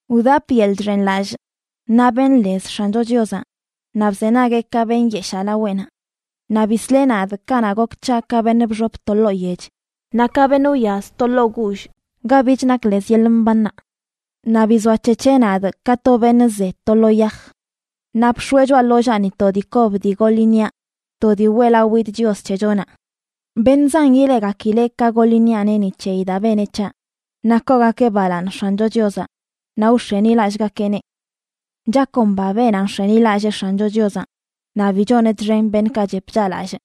Wdapꞌ yeḻꞌ chxenlallꞌ naꞌ benꞌ lez X̱ancho Chiozaꞌ, naꞌ bzenagueꞌ ka benyeshaa laweꞌnaꞌ. Naꞌ bisleꞌ nadꞌ kanaꞌ gok c̱haꞌ ka beṉꞌ bxop to ḻoo yech naꞌ ka beṉꞌ wyaz to ḻoo guullꞌ ga bich nak lez yeḻꞌ mbannaꞌ. Naꞌ bizoac̱hec̱heꞌ nadꞌ ka to beṉꞌ ze to lo yaj. Naꞌ bx̱oeꞌ choꞌa ḻollaani to dii kob dii goḻ iṉiaꞌ, to dii weꞌlawidꞌ Chios c̱hechonaꞌ. Beṉꞌ zan ileꞌgakileꞌ ka goḻ iṉiaꞌneꞌ ni c̱heyi daa beneꞌ c̱haꞌ, naꞌ koogakeꞌ balaaṉ X̱ancho Chiozaꞌ naꞌ wx̱enilallꞌgakeꞌneꞌ. Chakomba beenaꞌ nx̱enilallee X̱ancho Chiozaꞌ, naꞌ bi choneꞌ txen beṉꞌkaꞌ chep chaꞌlallꞌ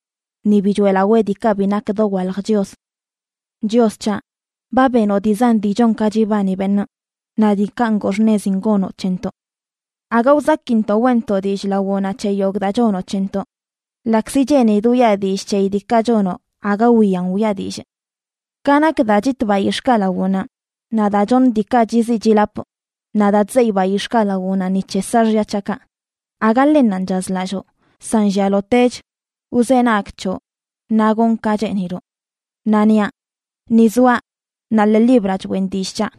ni bi choeꞌlawee diikaꞌ bi nak dowalj chios. Chios c̱haꞌ, ba benoꞌ dii zan dii chon ka chibani beṉꞌ, naꞌ diikaꞌ ngoo xṉezin gonoꞌ c̱hentoꞌ. Aga wzakintoꞌ weꞌntoꞌ dillꞌ lawoꞌnaꞌ c̱he yogꞌ daa chonoꞌ c̱hentoꞌ. Ḻaꞌkzi cheenidꞌ wiꞌa dillꞌ c̱heyi diikaꞌ chonoꞌ, aga wiyan wiꞌa dillꞌ. Ka nak daa chitꞌ bayix̱ꞌkaꞌ lawoꞌnaꞌ, naꞌ daa choṉꞌ diikaꞌ chiziꞌ chilapꞌ, naꞌ daa chzeyꞌ bayix̱ꞌkaꞌ lawoꞌnaꞌ ni c̱he saaxya c̱haꞌkaꞌ, aga ḻennanꞌ chazlalloo, san llialotech wzenagꞌ c̱hoꞌ naꞌ gonꞌ ka cheeniloꞌ. Naꞌ niaꞌ: Ni zoaꞌ, naꞌ ḻee libraꞌ choꞌen dillꞌ c̱haꞌ.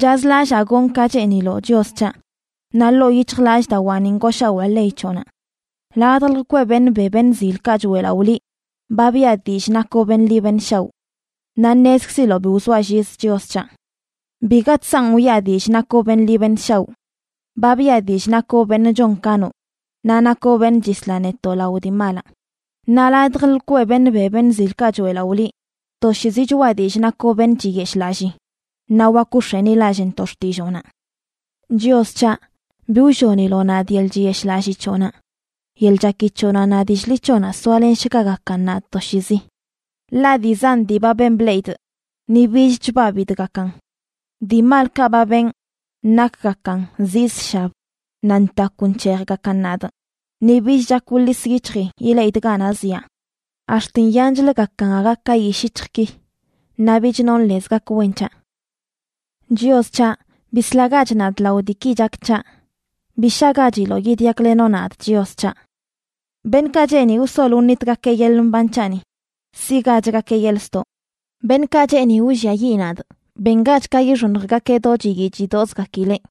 Chazlallaa gonꞌ ka cheeniloꞌ, Chios c̱haꞌ; naꞌ ḻoo yic̱hjlallꞌdawaani ngooshawaa ley c̱hoꞌnaꞌ. Ladj lkweꞌ beṉꞌ be beṉꞌ zilkaꞌ choeꞌlaꞌo liꞌ ba biꞌa dillꞌ nakoꞌ beṉꞌ ḻi beṉꞌ shaoꞌ. ¡Naꞌ ṉezkziloꞌ bi wzoaꞌ llizə, Chios c̱haꞌ! Biga chsanꞌ wiꞌa dillꞌ nakoꞌ beṉꞌ ḻi beṉꞌ shaoꞌ. Ba biꞌa dillꞌ nakoꞌ beṉꞌ chon ka noꞌ naꞌ nakoꞌ beṉꞌ chisla netoꞌ lao dii malaꞌ. Naꞌ ladj lkweꞌ beṉꞌ be beṉꞌ zilkaꞌ choeꞌlaꞌo liꞌ; toshiizi choꞌa dillꞌ nakoꞌ beṉꞌ chiyeshꞌlallii naꞌ wak wx̱enilallꞌntoꞌ xtilloonaꞌ. Chios c̱haꞌ, bi wlloniloꞌ nadꞌ yeḻꞌ chiyeshꞌlallii c̱hoꞌnaꞌ. Yeḻꞌ chaki c̱hoꞌnaꞌ naꞌ dillꞌ ḻi c̱hoꞌnaꞌ soalenshgagakan nadꞌ toshiizi. Ḻaꞌ dii zan dii ba ben bleꞌidꞌ, ni bich chbabidꞌgakan. Dii malkaꞌ ba benꞌ nakgakan zii zshab naꞌ ntakw nc̱hejgakan nadꞌ, ni bich chak wḻis yic̱hjii ileꞌidꞌ ganaꞌ zyaa. Ax̱t nyanchləgakan aga ka yishꞌ yic̱hjꞌki, naꞌ bich nonꞌ lez gak wen c̱haꞌ. Chios c̱haꞌ, ¡bislagach nadꞌ lao diiki chak c̱haꞌ! Bi shagachiloꞌ yidyaklenoꞌ nadꞌ, Chios c̱haꞌ. Beṉꞌkaꞌ cheeni wsol wṉitgakeꞌ yeḻꞌ mban c̱haꞌni siꞌgachgakeꞌ yeḻꞌ ztoꞌ. Beṉꞌkaꞌ cheeni wlliayiꞌ nadꞌ, bengach ka yixoṉjgakeꞌ do chiyii chidoꞌzgakileꞌ.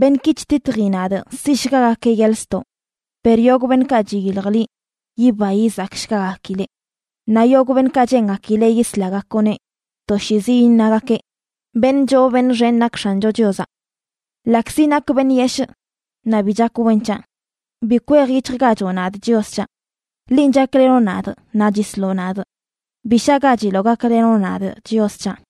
Beṉꞌki chtitji nadꞌ siꞌshgagakeꞌ yeḻꞌ ztoꞌ. Per yogꞌ beṉꞌkaꞌ chiyilj liꞌ, yiba yizakshgagakileꞌ; naꞌ yogꞌ beṉꞌkaꞌ cheengakileꞌ yislagakoꞌneꞌ, toshiizi iṉagakeꞌ: “Beṉꞌ choo beṉꞌ xen nak X̱ancho Chiozaꞌ.” Ḻaꞌkzi nakꞌ beṉꞌ yeshꞌ, naꞌ bi chak wen c̱haꞌ, bi kwejyic̱hjgachoꞌ nadꞌ, Chios c̱haꞌ. Linꞌ chaklenoꞌ nadꞌ naꞌ chisloꞌ nadꞌ; bi shaꞌgachiloꞌ gaklenoꞌ nadꞌ, Chios c̱haꞌ.